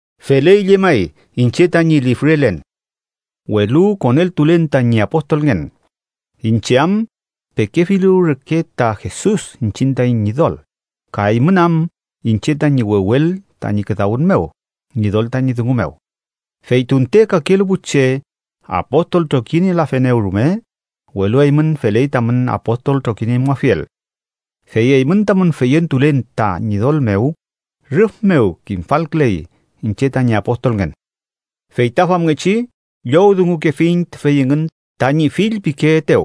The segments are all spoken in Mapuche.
Feley llemay iñche tañi lifrelen, welu koneltulen tañi apostolngen, iñche am pekefilu reke ta Jesus iñchiñ taiñ Ñidol ka eymün am iñche tañi wewel tañi küdawün mew Ñidol tañi dungu mew. Fey tunte kakelu pu che apostol trokinielafenew rume, welu eymün feley tamün apostol trokiniemuafiel, fey eymün tamün feyentulen ta Ñidol mew rüf mew kimfalküley iñche tañi apostolngen. Fey ta famngechi llowdungukefiñ tüfey engün tañi fillpikeetew: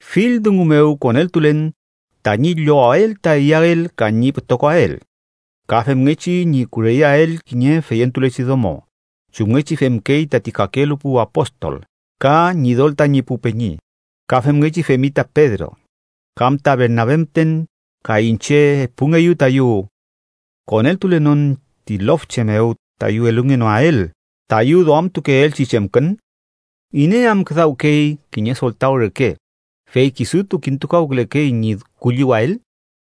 Fill dungu mew koneltulen tañi llowael ta iyael ka ñi pütokoael, ka femngechi ñi kureyeael kiñe feyentulechi domo, chumngechi femkey tati kakelu pu apostol, ka Ñidol tañi pu peñi, ka femngechi femi ta Pedro. ¿Kam ta Bernabe müten ka iñche epungeyu tayu koneltulenon ti lofche mew tayu elungenoael tayu duamtukeelchi chemkün? ¿Iney am küdawkey kiñe soltaw reke fey kisutu kintukawkülekey ñi kulliwael?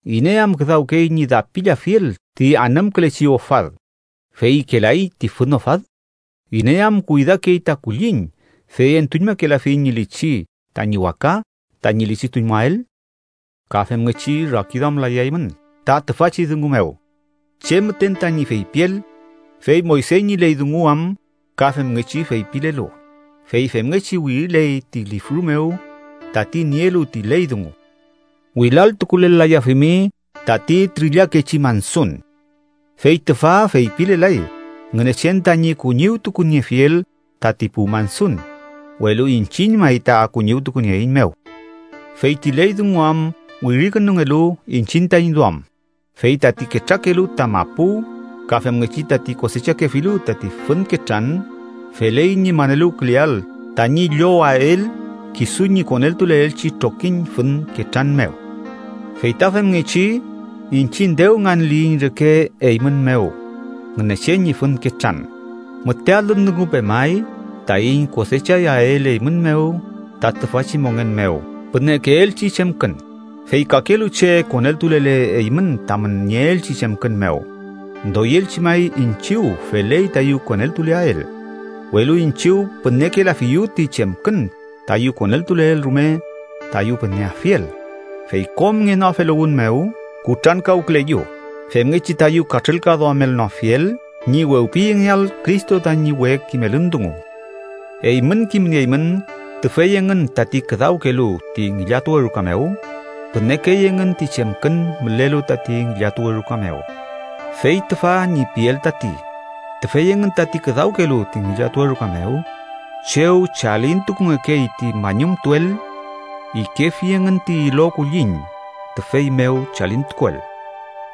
¿Iney am küdawkey ñi dapillafiel ti anümkülechi ofad, fey ikelay ti fün ofad? ¿Iney am kuydakey ta kulliñ fey entuñmakelafi ñi lichi tañi waka tañi lichituñmuael? Ka femngechi rakiduamlayaymün ta tüfachi dungu mew, che müten tañi feypiel, fey Moyse ñi ley dungu am ka femngechi feypilelu: Fey femngechi wiriley ti lifru mew tati nielu ti ley dungu: “Wilal tukulel-layafimi tati trillakechi mansun.” Fey tüfa feypilelay Ngünechen tañi kuñiwtukuniefiel tati pu mansun, welu iñchiñ may ta kuñiwtukunieeiñmew. Fey ti ley dungu am wirikünungelu iñchiñ taiñ duam. Fey tati ketrakelu ta mapu ka femngechi tati kosechakefilu tati fün ketran, feley ñi maneluwküleael tañi llowael kisu ñi koneltuleelchi trokiñ fün ketran mew. Fey ta femngechi, iñchiñ dew nganliyiñ reke eymün mew Ngünechen ñi fün ketran, müte alün dungu pemay taiñ kosechayael eymün mew ta tüfachi mongen mew pünekeelchi chemkün. Fey kakelu che koneltulele eymün tamün nieelchi chemkün mew, doyelchi may iñchiw feley tayu koneltuleael. Welu iñchiw pünekelafiyu ti chemkün tayu koneltuleel rume tayu püneafiel, fey kom ngenoafeluwün mew kutrankawküleyu femngechi tayu katrülkaduamelnoafiel ñi wewpiyengeael Cristo tañi we kimelün dungu. Eymün kimnieymün tüfey engün tati küdawkelu ti ngillatuwe ruka mew, pünekey engün ti chemkün mülelu tati ngillatuwe ruka mew. Fey tüfa ñi piel tati, tüfey engün tati küdawkelu ti ngillatuwe ruka mew chew chalintukungekey ti mañumtuel, ikefi engün ti ilo kulliñ tüfey mew chalintukuel.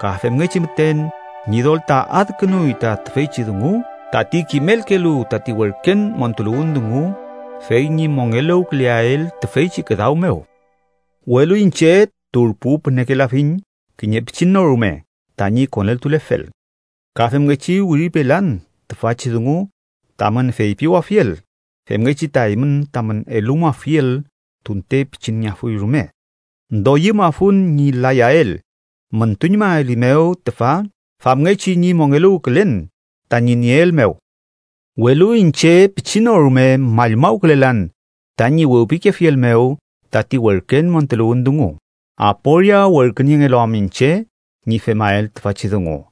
Ka femngechi müten, Ñidol ta adkünuy ta tüfeychi dungu tati kimelkelu tati werken montuluwün dungu, fey ñi mongeluwküleael tüfeychi küdaw mew, welu iñche turpu pünekelafiñ kiñe pichin no rume tañi koneltulefel, ka femngechi wiripelan tüfachi dungu tamün feypiwafiel femngechi ta eymün tamün elumuafiel tunte pichinngeafuy rume. ¡Doyümafun ñi layael müntuñmaelimew tüfa famngechi ñi mongeluwkülen tañi nieel mew! Welu iñche pichin no rume mallmawkülelan tañi wewpikefiel mew tati werken montuluwün dungu, aporia werküniengelu am iñche ñi femael tüfachi dungu.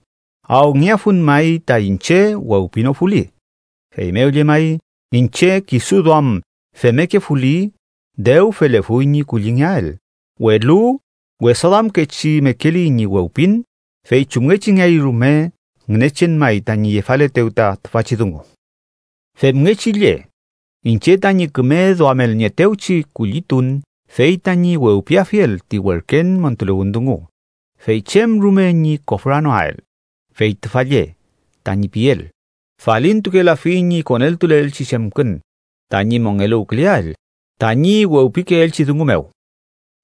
¡Awngeafun may ta iñche wewpinofuli! Feymew llemay, iñche kisu duam femmekefuli, dew felefuy ñi kullingeael, welu wesaduamkechi mekeli ñi wewpin, fey chumngechingeay rume Ngünechen may tañi yefaletew ta tüfachi dungu. Femngechi lle, iñche tañi küme duamelnieetewchi kullitun fey tañi wewpiafiel ti werken montuluwün dungu, fey chem rume ñi kofranoael. Fey tüfa lle tañi piel: falintukelafiñ ñi koneltuleelchi chemkün tañi mongeluwküleael tañi wewpikeelchi dungu mew.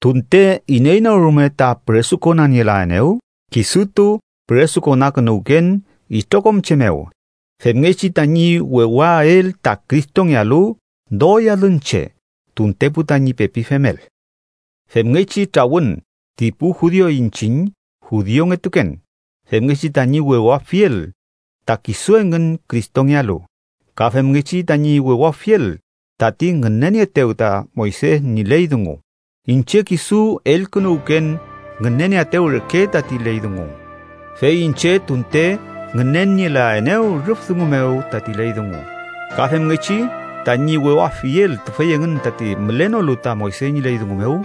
Tunte iney no rume ta püresukonanielaenew, kisutu püresukonakünuwken itrokom che mew femngechi tañi wewael ta Cristongealu doy alün che tuntepu tañi pepi femel. Femngechi trawün ti pu judiu iñchiñ judiungetuken, femngechi tañi wewafiel ta kisu engün Cristongealu, ka femngechi tañi wewafiel tati ngünenieetew ta Moyse ñi ley dungu, iñche kisu elkünuwken ngünenieaetew reke tati ley dungu, fey iñche tunte ngünenielaenew rüf dungu mew tati ley dungu. Ka femngechi, tañi wewafiel tüfey engün tati mülenolu ta Moyse ñi ley dungu mew,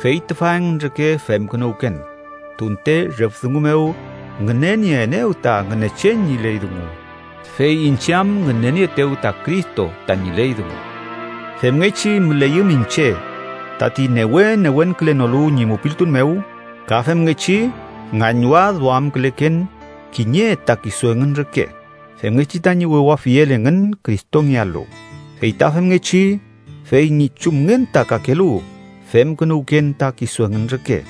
fey tüfa engün reke femkünuwken, tunte rüf dungu mew ngünenieenew ta Ngünechen ñi ley dungu, fey iñche am ngünenieetew ta Cristo tañi ley dungu. Femngechi müleyüm iñche tati newe newenkülenolu ñi mupiltun mew, ka femngechi ngañwadduamküleken kiñe ta kisu engün reke, femngechi tañi wewafiel engün Cristongealu. Fey ta femngechi fey ñi chumngen ta kakelu femkünuwken ta kisu engün reke,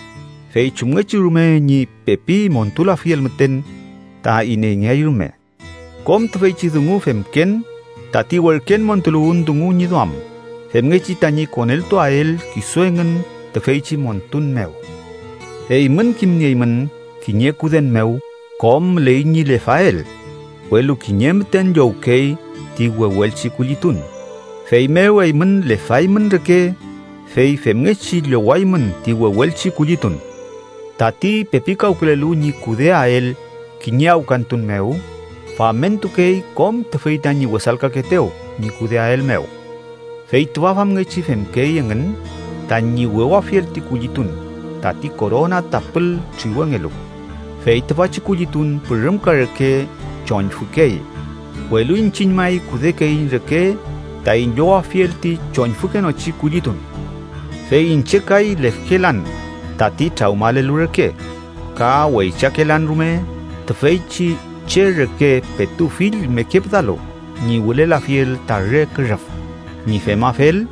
fey chumngechi rume ñi pepi montulafiel müten ta ineyngeay rume. Kom tüfeychi dungu femken tati werken montuluwün dungu ñi duam, femngechi tañi koneltuael kisu engün tüfeychi montun mew. Eymün kimnieymün kiñe kuden mew kom müley ñi lefael, welu kiñe müten llowkey ti wewelchi kullitun. Feymew, eymün lefaymün reke, fey femngechi llowaymün ti wewelchi kullitun. Tati pepikawkülelu ñi kudeael kiñe awkantun mew, famentukey kom tüfey tañi wesalkakeetew ñi kudeael mew. Fey tüfa famngechi femkey engün tañi wewafiel ti kullitun tati korona tapül triwengelu, fey tüfachi kullitun pürümka reke choñfükey, welu iñchiñ may kudekeiñ reke taiñ llowafiel ti choñfükenochi kullitun. Fey iñche kay lefkelan tati trawmalelu reke, ka weychakelan rume tüfeychi che reke petu fill mekepüdalu ñi wülelafiel ta re kürüf. Ñi femafel,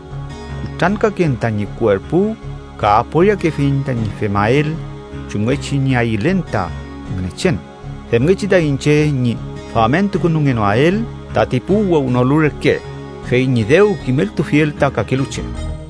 kutrankaken tañi kuerpu ka aporiakefiñ tañi femael chumngechi ñi ayülen ta Ngünechen, femngechi ta iñche ñi famentukünungenoael tati pu wewnolu reke, fey ñi dew kimeltulfiel ta kakelu che.